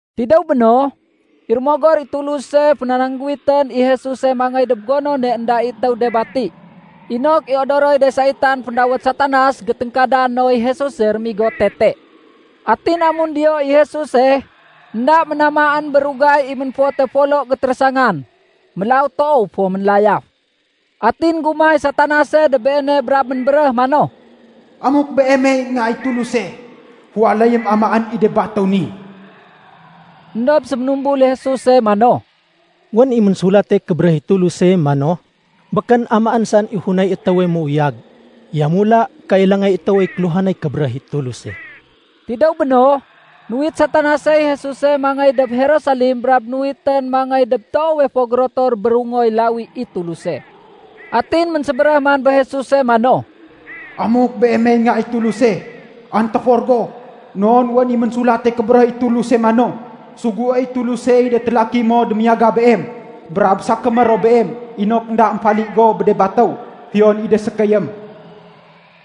Tidéw béno, i Rémogor i Tuluse fénanangguwitén i Jesuse mangéy dob gonone énda i étéw de bati, inok i odoroy de saitan féndawét Satanas géténgkada noy Jesuse rémigo tete. Atin amun diyo i Jesuse, énda ménamaén bé rugay i ménfote folo gétérésangan. Mélaw toow fo ménlayaf. Atin énggumah i Satanase dob Beene brab ménbéréh mano, “Amuk Beemey Nga i Tuluse, féwaléyém amaén i de batéw ni.” Endob séménumbul i Jesuse mano, “Wén i Ménsulate Kébéréh i Tuluse mano, ‘Békén amaén saén i funay étéwe méuyag. Yamula kailangay étéwey kéluhanay kébéréh i Tuluse.’” Tidéw béno, nuwit Satanasey Jesuse mangéy dob Jerusalem brab nuwitén mangéy dob toowe fo gérotor bérungoy lawi i Tuluse. Atin ménsébéréh man bé Jesuse mano, “Amuk Beemey Nga i Tuluse, antéfor go. Non wén i Ménsulate Kébéréh i Tuluse mano, ‘Suguéy Tulusey de télaki no démiyaga Beem. Brab sakémé ro Beem inok énda émfali go bé de batéw, fiyon i de sékéyém.’”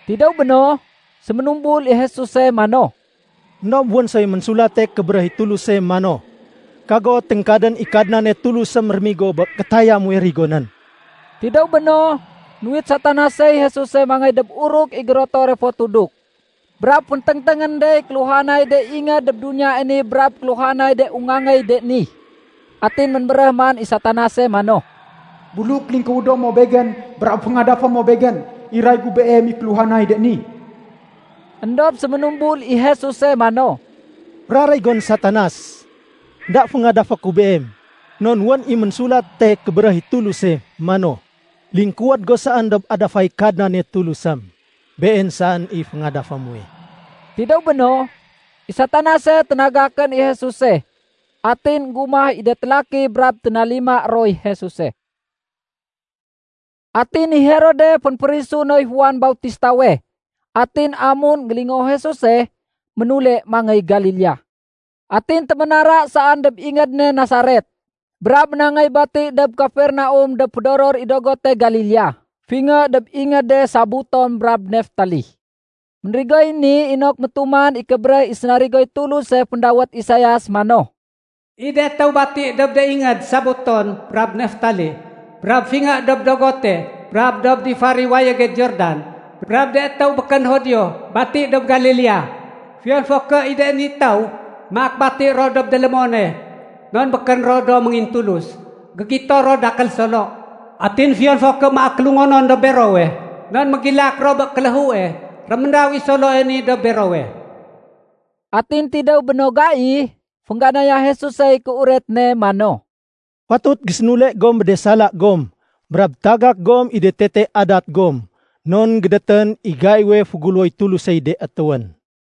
Tidéw béno, séménumbul i Jesuse mano, “Endob wén soy Ménsulate Kébéréh i Tuluse mano, ‘Kago téngkadén i Kadnane Tulusém rémigo bé kétaya muwe rigonén.’” Tidéw béno, nuwit Satanasey Jesuse mangéy dob uruk i gérotore fo tuduk. Brab fénténgténgén dey kéluhanay de ingéd dob duniyae ni brab kéluhanay de ungangéy de ni. Atin ménbéréh man i Satanase mano, “Buluk lingkuwédo mo begén brab féngadafé mo begén, iray gu Beem i kéluhanay de ni.” Endob séménumbul i Jesuse mano, “Féraréy gon Satanas! Enda féngadafé ku beem non wén i Ménsulate Kébéréh i Tuluse mano, ‘Lingkuwéd go saén dob adafay Kadnane Tulusém. Been saén i féngadafé muwe.’” Tidéw béno, i Satanase ténagakén i Jesuse. Atin énggumah i de télaki brab ténalima roy Jesuse. Atin i Herode fénféférisu noy Juan Bautistawe. Atin amun énggélingoo Jesuse, ménule mangéy Galilea. Atin téménara saén dob ingéd ne Nasaret, brab ménangéy bati dob Kafernaum dob fédoror i dogote Galilea, fingé dob ingéde Sabuton brab Neftali. Ménrigoy ni inok métuman i kébéréh i sénarigoy Tuluse féndawét Isaias mano, “I de étéw bati dob de ingéd Sabuton brab Neftali, brab fingé dob dogote, brab dob difar i wayége Jordan, brab de étéw békén Judio bati dob Galilea, fiyon fo ké i de ni étéw maak bati ro dob délémone non békén ro do méngintulus, gégito ro dakél solo. Atin fiyon fo ké maak kélungonon dob berowe non mégilak ro bé kéléhue, réméndaw i soloe ni dob berowe.” Atin tidéw bé no gai, féngganaya Jesusey kéuret ne mano, “Fatut gésénule gom bé de sala gom brab tagak gom i de tete adat gom, non gédétén i gaiwe féguléwoy Tulusey de étéwén.”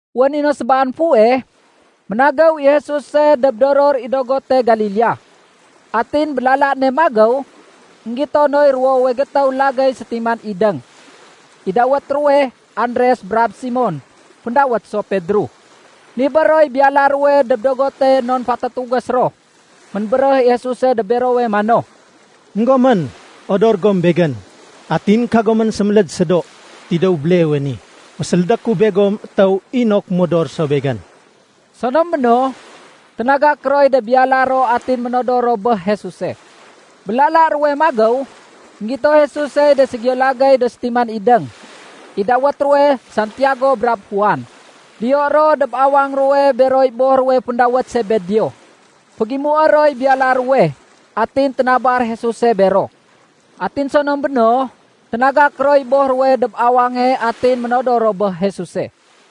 Wén i no sébaan fuweh, ménagéw i Jesuse dob doror i dogote Galilea. Atin bé lala ne magéw, énggito noy ruwowe gétéw lagéy sétiman idéng. I dawét ruwe Andres brab Simon (féndawét so Pedro). Nibér roy biyala ruwe dob dogote non fatatugés ro. Ménbéréh i Jesuse dob berowe mano, “Enggomén, odor gom Begén, atin kagomén séméléd sédo. Tidéw béleewe ni, fésélédé ku begom étéw, inok modor ro so Begén.” Sonom béno, ténagak roy de biyala ro atin ménodor ro bé Jesuse. Bé lala ruwe magéw, énggito Jesusey de ségiyo lagéy do sétiman idéng. I dawét ruwe Santiago brab Juan. Diyo ro dob awang ruwe beroy boh ruwe féndawét Sebedeo. Fégimué roy biyala ruwe. Atin ténabar Jesuse bero. Atin sonom béno, ténagak roy boh ruwe dob awange atin ménodor ro bé Jesuse.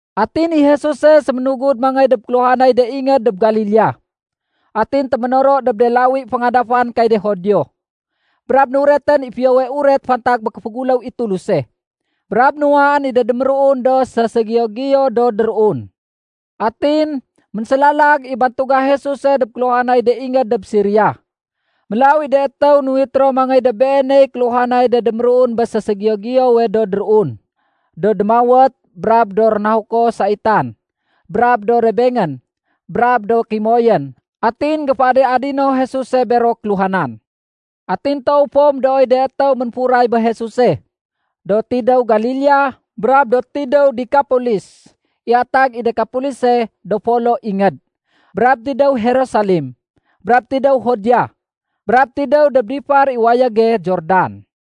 Atin i Jesuse séménugud mangéy dob kéluhanay de ingéd dob Galilea. Atin téménoro dob de lawi féngadafan kay de Judio, brab nuretén i Fiyowe Uret fantag bé kéféguléw i Tuluse, brab nuwaén i de déméruun do séségiyo-giyo do déruun. Atin, ménsélalag i bantuga Jesuse dob kéluhanay de ingéd dob Siria. Mélaw i de étéw nuwit ro mangéy dob Beeney kéluhanay de déméruun bé séségiyo-giyowe do déruun, do démawét, brab do rénahuko saitan, brab do rebengén, brab do kimoyén. Atin énggéféadi-adino Jesuse bero kéluhanan. Atin toow fo médooy de étéw ménfuray bé Jesuse, do tidéw Galilea, brab do tidéw Dekapolis (i atag i Dekapolise “Do Folo Ingéd”), brab tidéw Jerusalem, brab tidéw Judea, brab tidéw dob difar i wayége Jordan.